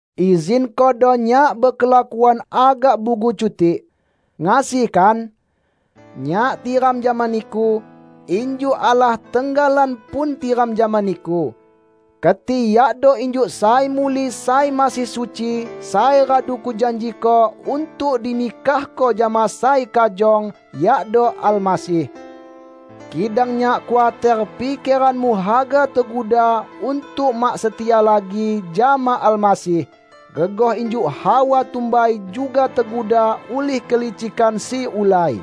Izinkodo nyak bekelakuan agak bugu cutik. Ngasi, kan? Nyak tiram jama niku, injuk Allah tenggalan pun tiram jama niku. Keti yakdo injuk sai muli sai masih suci sai radu kujanjiko untuk dinikahko jama sai kajong, yakdo Almasih. Kidang nyak khuater pikeranmu haga teguda untuk mak setia lagi jama Almasih, gegoh injuk Hawa tumbai juga teguda ulih kelicikan si ulai.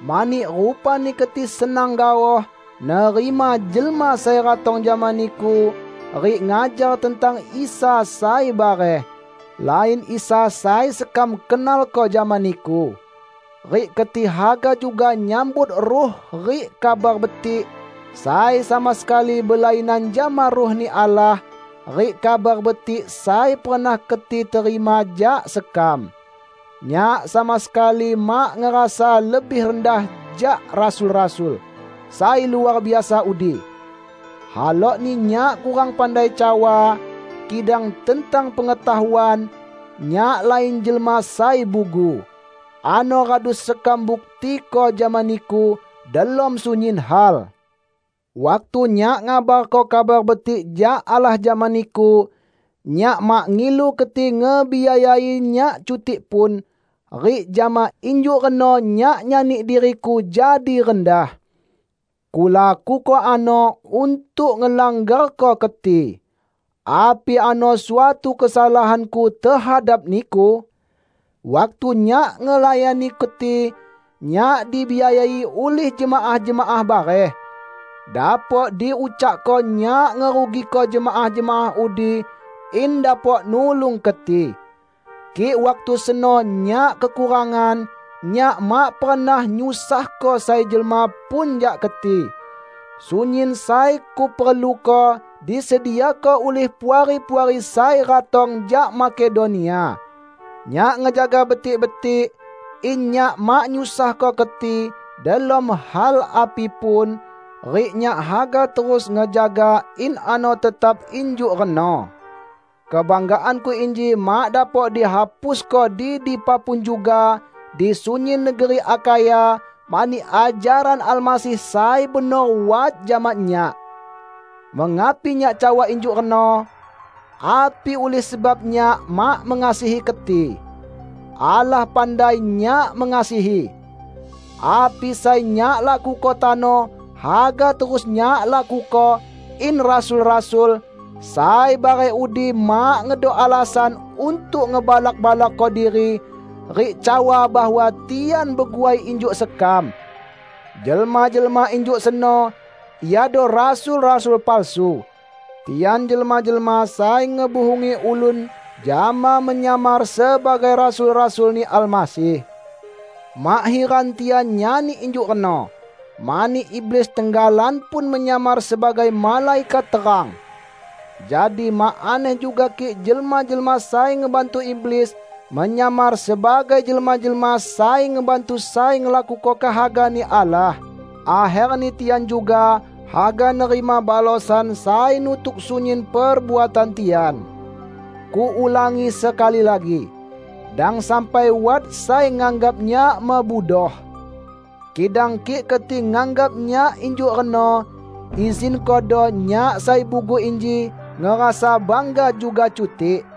Mani rupani keti senang gaoh nerima jelma sai ratong jama niku rik ngajar tentang Isa sai bareh -- lain Isa sai sekam kenalko jama niku. Rik keti haga juga nyambut ruh rik "kabar betik" sai sama sekali belainan jama Ruh-Ni Allah rik Kabar Betik sai pernah keti terima jak sekam. Nyak sama sekali mak ngerasa lebih rendah jak "rasul-rasul" sai luar biasa udi! Halokni nyak kurang pandai cawa, kidang tentang pengetahuan, nyak lain jelma sai bugu. Ano radu sekam buktiko jama niku delom sunyin hal. Waktu nyak ngabarko Kabar Betik jak Allah jama niku, nyak mak ngilu keti ngebiayai nyak cutik pun; rik jama injuk reno nyak nyani diriku jadi rendah. Kulakuko ano untuk ngelanggarko keti. Api ano suatu kesalahanku tehadap niku? Waktu nyak ngelayani keti, nyak dibiayai ulih jemaah-jemaah bareh. Dapok diucakko nyak ngerugiko jemaah-jemaah udi in dapok nulung keti. Kik waktu seno nyak kekurangan, nyak mak pernah nyusahko sai jelma pun jak keti. Sunyin sai kuperluko disediako ulih puari-puari sai ratong jak Makedonia. Nyak ngejaga betik-betik in nyak mak nyusahko keti delom hal api pun, rik nyak haga terus ngejaga in ano tetap injuk reno. Kebanggaanku inji mak dapok dihapusko di dipa pun juga di sunyin negeri Akhaya, mani ajaran Almasih sai benor wat jama nyak. Mengapi nyak cawa injuk reno? Api ulih sebab nyak mak mengasihi keti? Allah pandai nyak mengasihi! Api sai nyak lakuko tano haga terus nyak lakuko in "rasul-rasul" sai bareh udi mak ngedok alasan untuk ngebalak-balakko diri rik cawa bahwa tian beguai injuk sekam. Jelma-jelma injuk seno iado rasul-rasul palsu. Tian jelma-jelma sai ngebuhungi ulun jama menyamar sebagai rasul-rasul-Ni Almasih. Mak hiran tian nyani injuk reno, mani iblis tenggalan pun menyamar sebagai malaikat terang! Jadi mak aneh juga kik jelma-jelma sai ngebantu iblis menyamar sebagai jelma-jelma sai ngebantu sai ngelakuko kehaga-Ni Allah. Akherni tian juga haga nerima balosan sai nutuk sunyin perbuatan tian. Kuulangi sekali lagi: Dang sampai wat sai nganggap nyak mebudoh. Kidang kik keti nganggap nyak injuk reno, izinkodo nyak sai bugu inji ngerasa bangga juga cutik.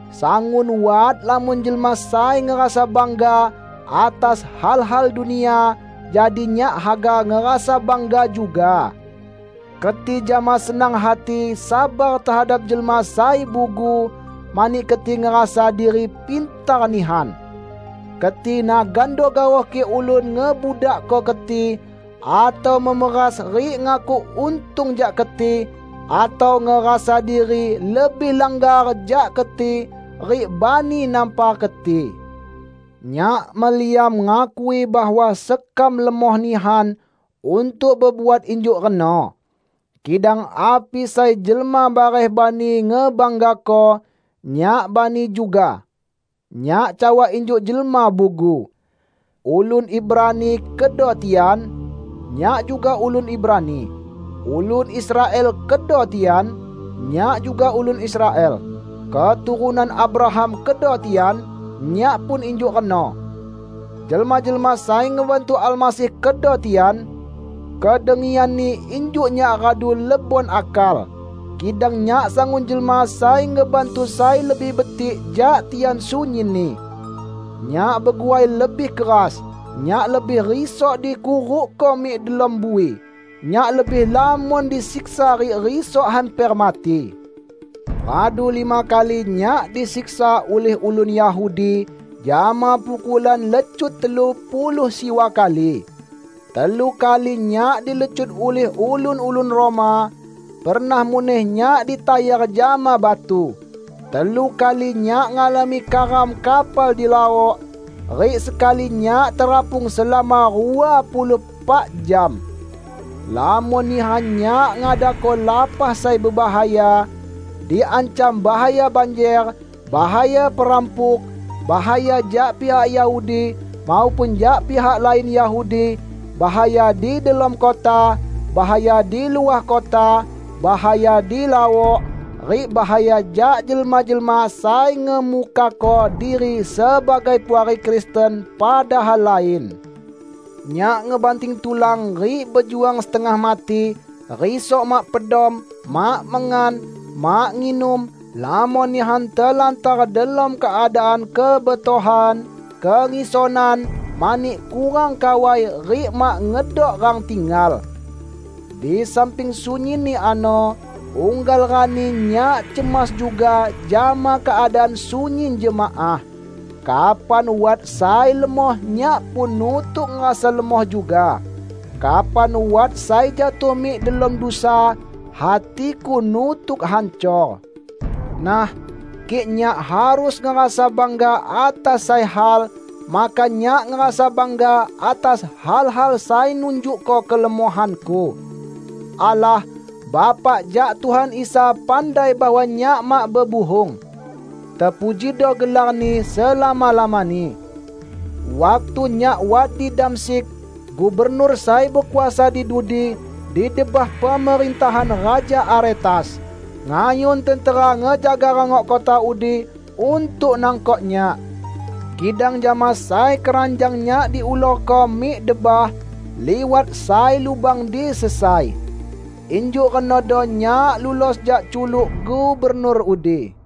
Sangun wat lamon jelma sai ngerasa bangga atas hal-hal dunia, jadi nyak haga ngerasa bangga juga. Keti jama senang hati sabar tehadap jelma sai bugu, mani keti ngerasa diri pintar nihan! Keti nagando gaoh kik ulun ngebudakko keti, atau memeras rik ngakuk untung jak keti, atau ngerasa diri lebih langgar jak keti rik bani nampar keti. Nyak meliam ngakui bahwa sekam lemoh nihan untuk bebuat injuk reno. Kidang api sai jelma bareh bani ngebanggako, nyak bani juga! (Nyak cawa injuk jelma bugu.) Ulun Ibrani kedo tian? Nyak juga ulun Ibrani. Ulun Israel kedo tian? Nyak juga ulun Israel. Keturunan Abraham kedo tian? Nyak pun injuk reno! Jelma-jelma sai ngebantu Almasih kedo tian? Kedengianni injuk nyak radu lebon akal, kidang nyak sangun jelma sai ngebantu sai lebih betik jak tian sunyinni! Nyak beguai lebih keras, nyak lebih risok dikurukko mik delom bui, nyak lebih lamon disiksa rik risok hamper mati. Radu lima kali nyak disiksa ulih ulun Yahudi jama pukulan lecut telu puluh siwa kali. Telu kali nyak dilecut ulih ulun-ulun Roma; pernah muneh nyak ditayar jama batu. Telu kali nyak ngalami karam kapal di laok, rik sekali nyak terapung selama rua puluh epak jam. Lamon nihan nyak ngadako lapah sai bebahaya: diancam bahaya banjer, bahaya perampuk, bahaya jak pihak Yahudi maupun jak pihak lain Yahudi, bahaya di delom kota, bahaya di luah kota, bahaya di laok, rik bahaya jak jelma-jelma sai ngemukako diri sebagai puari Kristen padahal lain. Nyak ngebanting tulan rik bejuang setengah mati: risok mak pedom, mak mengan, mak nginum, lamon nihan telantar delom keadaan kebetohan, kengisonan mani kurang kawai rik mak ngedok rang tinggal. Di samping sunyinni ano, unggal rani nyak cemas juga jama keadaan sunyin jemaah. Kapan wat sai lemoh nyak pun nutuk ngerasa lemoh juga. Kapan wat sai jatuh mik delom dusa, hatiku nutuk hancor. Nah, kik nyak harus ngerasa bangga atas sai hal, maka nyak ngerasa bangga atas hal-hal sai nunjukko kelemohanku. Allah, Bapak jak Tuhan Isa pandai bahwa nyak mak bebuhung. Tepujido gelar-Ni selama-lamani. Waktu nyak wat di Damsyik, gubernur sai bekuasa di dudi di debah pemerintahan Raja Aretas, ngayun tentera ngejaga rangok kota udi untuk nangkok nyak. Kidang jama sai keranjang nyak diulurko mik debah liwat sai lubang di sesai. Injuk renodo nyak lulos jak culuk gubernur udi.